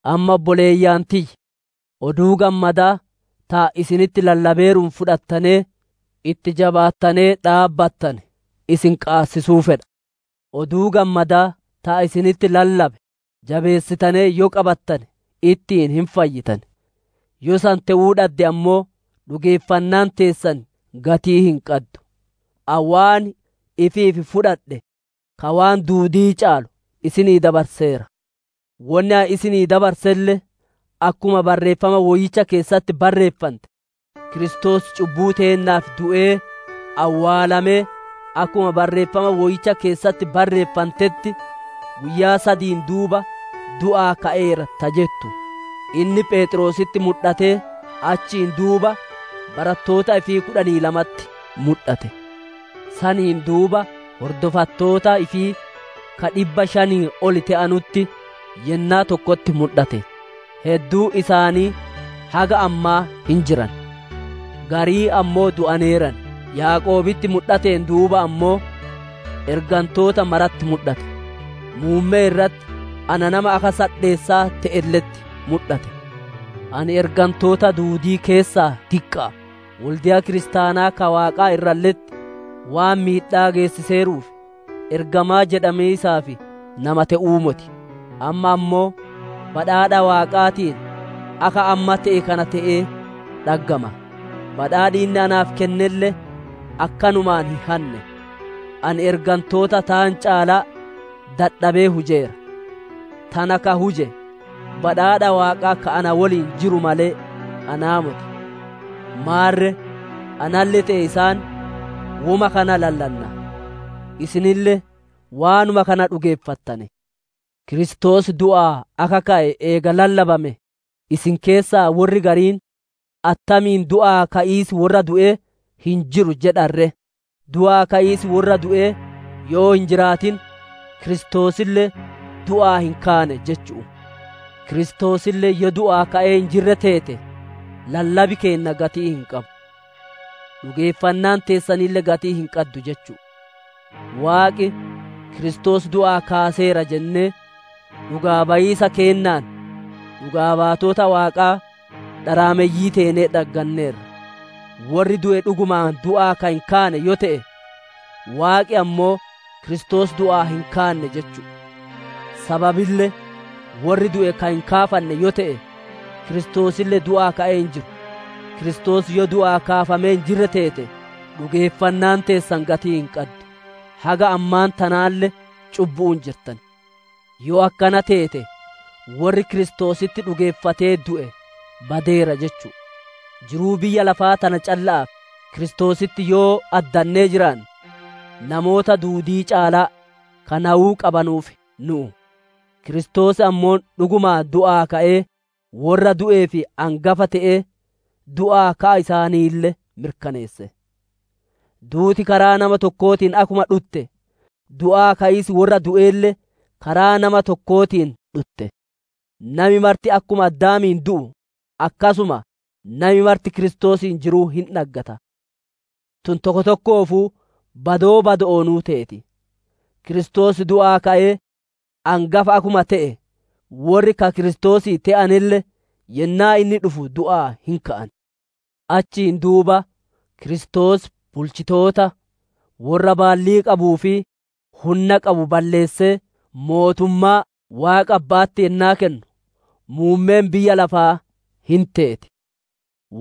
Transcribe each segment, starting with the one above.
Amma obboleeyyan tiyya! Oduu Gammadaa ta ani isinitti lallabeeruun fudhattanee, itti jabaattanee dhaabbattane, isin qaabachiisuu fedha. Oduu Gammadaa ta ani isinitti lallabe jabeessitanee yoo qabattane, ittiin hin fayyitan; yoo san te'uu dhadde ammoo, dhugeeffannaan teessan gatii hin qaddu. Ani waan ifiif fudhadhe ka waan duudii caalu isinii dabarseera; wonni ani isinii dabarselle: akkuma Barreeffama Woyyicha keessatti barreenfante Kiristoos cubbuu teennaaf du'ee, awwaalamee, akkuma Barreeffama Woyyicha keessatti barreeffantetti, guyyaa sadiin duuba du'aa ka'eera ta jettu. Inni Pheexroositti mudhattee, achiin duuba barattoota ifii kudhanii lamatti mudhate. Saniin duuba hordofattoota ifii ka dhibba shaniin ol te'anutti yennaa tokkotti mudhate; hedduun isaanii haga ammaa hin jiran; gariin ammoo du'aneeran. Yaaqoobitti mudhateen duuba ammoo, ergantoota maratti mudhate. Muummee irratti ana nama akka sadheessaa te'elle'etti mudhate. Ani ergantoota duudii keessaa diqqa'a; wolde'a Kiristaanaa ka Waaqaa irralle'etti waan miidhaa geessiseeruuf ergamaa jedhamiisaaf nama te'uu moti. Amma ammoo badhaadha Waaqaatiin akka amma te'e kana te'ee dhaggama; badhaadhi inni naaf kennelle akkanumaan hin hanne. Ani ergantoota taan caalaa dadhabee hujeera; tana ka huje badhaadha Waaqaa ka na woliin jiru malee, anaa moti. Maarre analle te'e isaan, woma kana lallanna; isinille waanuma kana dhugeeffattane. Kiristoos du'aa akka ka'e eega lallabame, isin keessaa worri gariin attamiin du'aa ka'iis worra du'ee hin jiru jedhan ree? Du'aa ka'iis worra du'ee yoo hin jiraatin, Kiristoosille du'aa hin kaane jechu'u. Kiristoosille yoo du'aa ka'ee hin jirre teete, lallabi keenna gatii hin qabu; dhugeeffannaan teessanille gatii hin qaddu jechu'u. Waaqi, Kiristoos du'aa kaaseera jennee, dhugaa bayiisa keennaan dhugaa baatota Waaqaa, dharaameyyii teenee dhagganneerra. Worri du'e dhugumaan du'aa ka hin kaane yoo te'e, Waaqi ammoo Kiristoos du'aa hin kaanne jechu'u. Sababille worri du'e ka hin kaafanne yoo te'e, Kiristoosille du'aa ka'ee hin jiru. Kiristoos yoo du'aa kaafamee hin jirre teete, dhugeeffannaan teessan gatii hin qaddu; haga ammaan tanaalle cubbu'uun jirtan. Yoo akkana teete worri Kiristoositti dhugeeffatee du'e badeera jechu'u. Jiruu biyya lafaa tana calla'aaf Kiristoositti yoo addannee jiraanne, namoota duudii caalaa ka nayuu qabanuuf nu'u. Kiristoos ammoo dhugumaan du'aa ka'ee, worra du'eef angafa te'ee du'aa ka'a isaanille mirkaneesse. Duuti karaa nama tokkootiin akkuma dhutte, du'aa ka'iis worra du'eelle karaa nama tokkootiin dhutte. Nami marti akkuma Addaamiin du'u, akkasuma nami marti Kiristoosiin jiruu hin dhaggata. Tun tokko tokkoofuu badoo badoo'oonuu teeti; Kiristoos du'aa ka'ee angafa akkuma te'e, worri ka Kiristoosii te'anelle, yennaa inni dhufu du'aa hin ka'an. Achiin duuba Kiristoos bulchitoota, worra baallii qabuu fi hunna qabu balleessee, mootummaa Waaqa Abba'atti yennaa kennu, muummeen biyya lafaa hin teeti.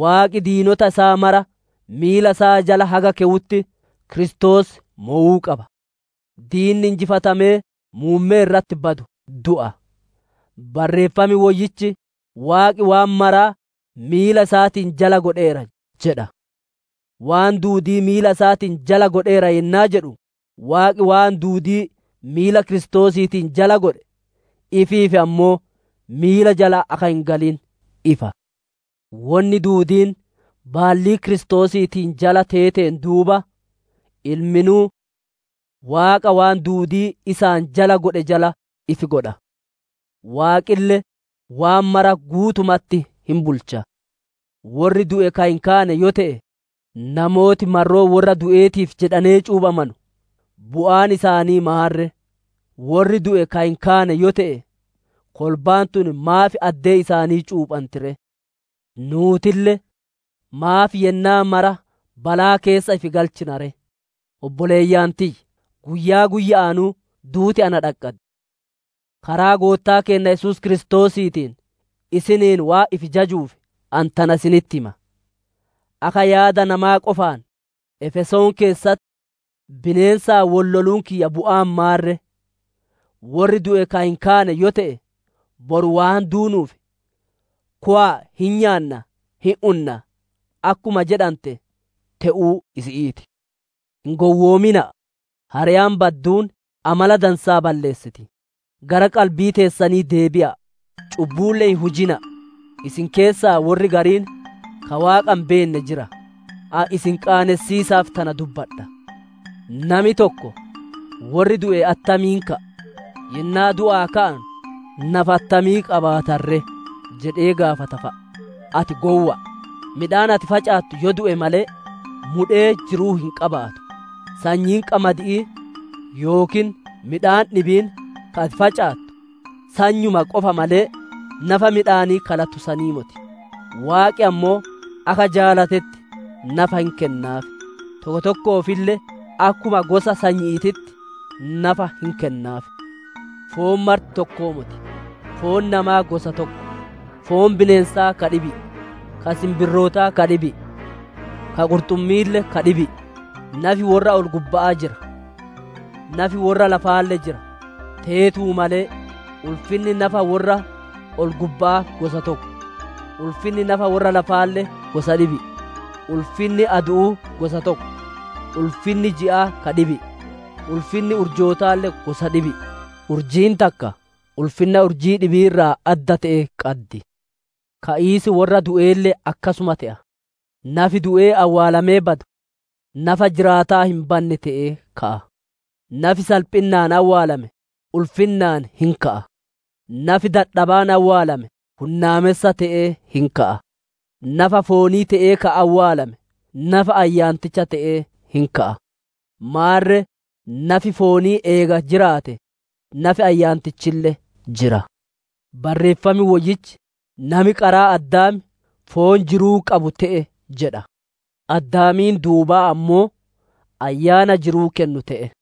Waaqi diinota isaa mara miila isaa jala haga keyutti, Kiristoos mowuu qaba. Diinni injifatamee muummee irratti badu du'a. Barreeffam Woyyichi, «Waaqi waan mara miila isaatiin jala godheera» jedha. «Waan duudii miila isaatiin jala godheera» yennaa jedhu, Waaqi waan duudii miila Kiristoosiitiin jala godhe, ifiif ammoo miila jala akka hin galiin ifa. Wonni duudiin baallii Kiristoosiitiin jala teeteen duuba, Ilminuu Waaqa waan duudii isaan jala godhe jala ifi godha; Waaqille waan mara guutumatti hin bulcha. Worri du'e ka hin kaane yoo te'e, namooti marroo worra du'eetiif jedhanee cuuphamanu bu'aan isaanii maan ree? Worri du'e ka hin kaane yoo te'e, kolbaan tun maaf addee isaanii cuuphanti ree? Nuutille maaf yennaa mara balaa keessa ifi galchina ree? Obboleeyyan tiyya! Guyyaa guyya'aanuu duuti na dhaqqaddi. Karaa Goottaa keenna Yesuus Kiristoosiitiin isiniin waan ifi jajuuf, ani tana isinitti hima. Akka yaada namaa qofaan, Efesoon keessatti bineensaan wol loluun kiyya bu'aan maan ree? Worri du'e ka hin kaane yoo te'e, «Boru waan duunuuf, kowa'a hin nyaanna, hin unna» akkuma jedhante te'uu isi'ii ti. Hin gowwoomina'a. «Hari'aan badduun amala dansaa balleessiti». Gara qalbii teessanii deebi'a'a. Cubbuulle hin hujina'a. Isin keessaa worri gariin ka Waaqa hin beenne jira. Ani isin qaanessiisaaf tana dubbadha. Nami tokko, «Worri du'e attamiin ka'a? Yennaa du'aa ka'anu nafa attamii qabaatan ree?» jedhee gaafata fa'a. Ati gowwa'a! Midhaan ati facaattu yoo du'e malee, mudhee jiruu hin qabaatu. Sanyiin qamadi'ii yookiin midhaan dhibiin ka ati facaattu, sanyuma qofa malee, nafa midhaanii ka latu sanii moti. Waaqi ammoo akka jaalatetti nafa hin kennaaf; tokko tokkoofille akkuma gosa sanyi'iititti nafa hin kennaaf. Foon marti tokkoo moti; foon namaa gosa tokko; foon bineensaa ka dhibi'i; ka sinbirrootaa ka dhibi'i; ka qurxummi'iille ka dhibi'i. Nafi worra ol-gubba'aa jira; nafi worra lafaalle jira. Teetuu malee ulfinni nafa worra ol-gubba'aa gosa tokko; ulfinni nafa worra lafaalle gosa dhibi'i. Ulfinni adu'uu gosa tokko; ulfinni ji'aa ka dhibi'i; ulfinni urjootaalle gosa dhibi'i; urjiin takka ulfinna urjii dhibi'ii irraa adda te'e qaddi. Ka'iis worra du'eelle akkasuma te'a. Nafi du'ee awwaalamee badu, nafa jiraataa hin banne te'ee ka'a. Nafi salphinnaan awwaalame, ulfinnaan hin ka'a; nafi dadhabaan awwaalame, hunnaamessa te'ee hin ka'a. Nafa foonii te'ee ka awwaalame nafa ayyaanticha te'ee hin ka'a. Maarre nafi foonii eega jiraate, nafi ayyaantichille jira. Barreeffam woyyichi, «Nami qaraa Addaam foon jiruu qabu te'e» jedha; Addaamiin duuba ammoo, Ayyaana jiruu kennu te'e.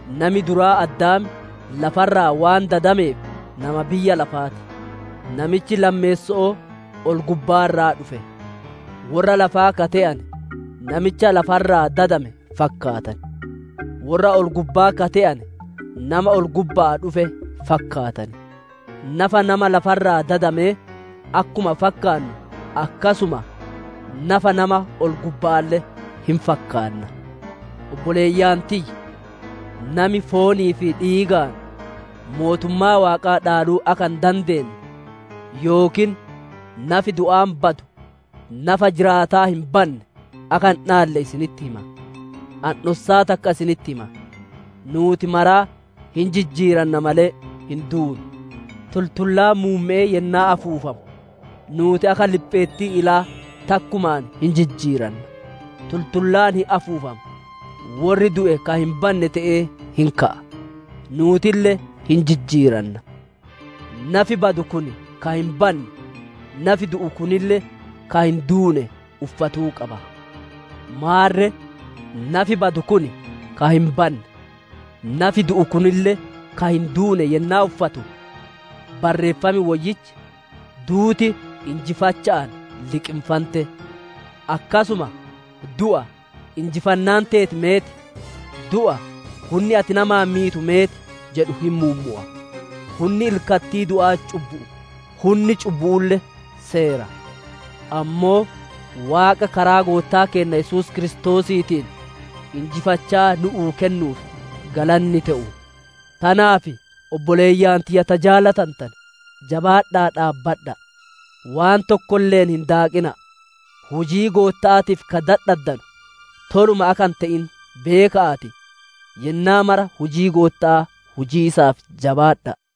Nami duraa Addaam lafa irraa waan dadameef, nama biyya lafaati; namichi lammeesso'oo ol-gubbaa irraa dhufe. Worra lafaa ka te'ane, namicha lafa irraa dadame fakkaatan; worra ol-gubba'aa ka te'ane nama ol-gubba'aa dhufe fakkaatan. Nafa nama lafa irraa dadamee akkuma fakkaannu, akkasuma nafa nama ol-gubba'aalle hin fakkaanna. Obboleeyyan tiyya! Nami foonii fi dhiigaan mootummaa Waaqaa dhaaluu akka hin dandeenne, yookiin nafi du'aan badu nafa jiraataa hin banne akka hin dhaalle isinitti hima. Ani dhossaa takka isinitti hima. Nuuti maraa hin jijjiiranna malee hin duunu. Tultullaan muumme'ee yennaa afuufamu, nuuti akka lipheettii ilaa takkumaan hin jijjiiranna. Tultullaan hin afuufama; worri du'e ka hin banne te'ee hin ka'a; nuutille hin jijjiiranna. Nafi badu kun ka hin banne, nafi du'u kunille ka hin duune uffatuu qaba. Maarre nafi badu kun ka hin banne, nafi du'u kunille ka hin duune yennaa uffatu, Barreeffam woyyichi, «Duuti injifacha'aan liqinfante»; akkasuma, «Du'a! Injifannaan teeti meet? Du'a! Hunni ati namaan miitu meet?» jedhu hin muummowa. Hunni ilkattii du'aa cubbu'u; hunni cubbu'uulle seera. Ammoo Waaqa Karaa Goottaa keenna Yesuus Kiristoosiitiin injifachaa nu'uu kennuuf galanni te'u! Tanaaf obboleeyyan tiyya ta jaalatantane! Jabaadha'aa dhaabbadha'a. Waan tokkolle'een hin daaqina'a. Hujii Gootta'aatiif ka dadhaddanu toluma akka hin te'in beeka'aatii, yennaa mara hujii Gootta'aa hujiisaaf jabaadha'a.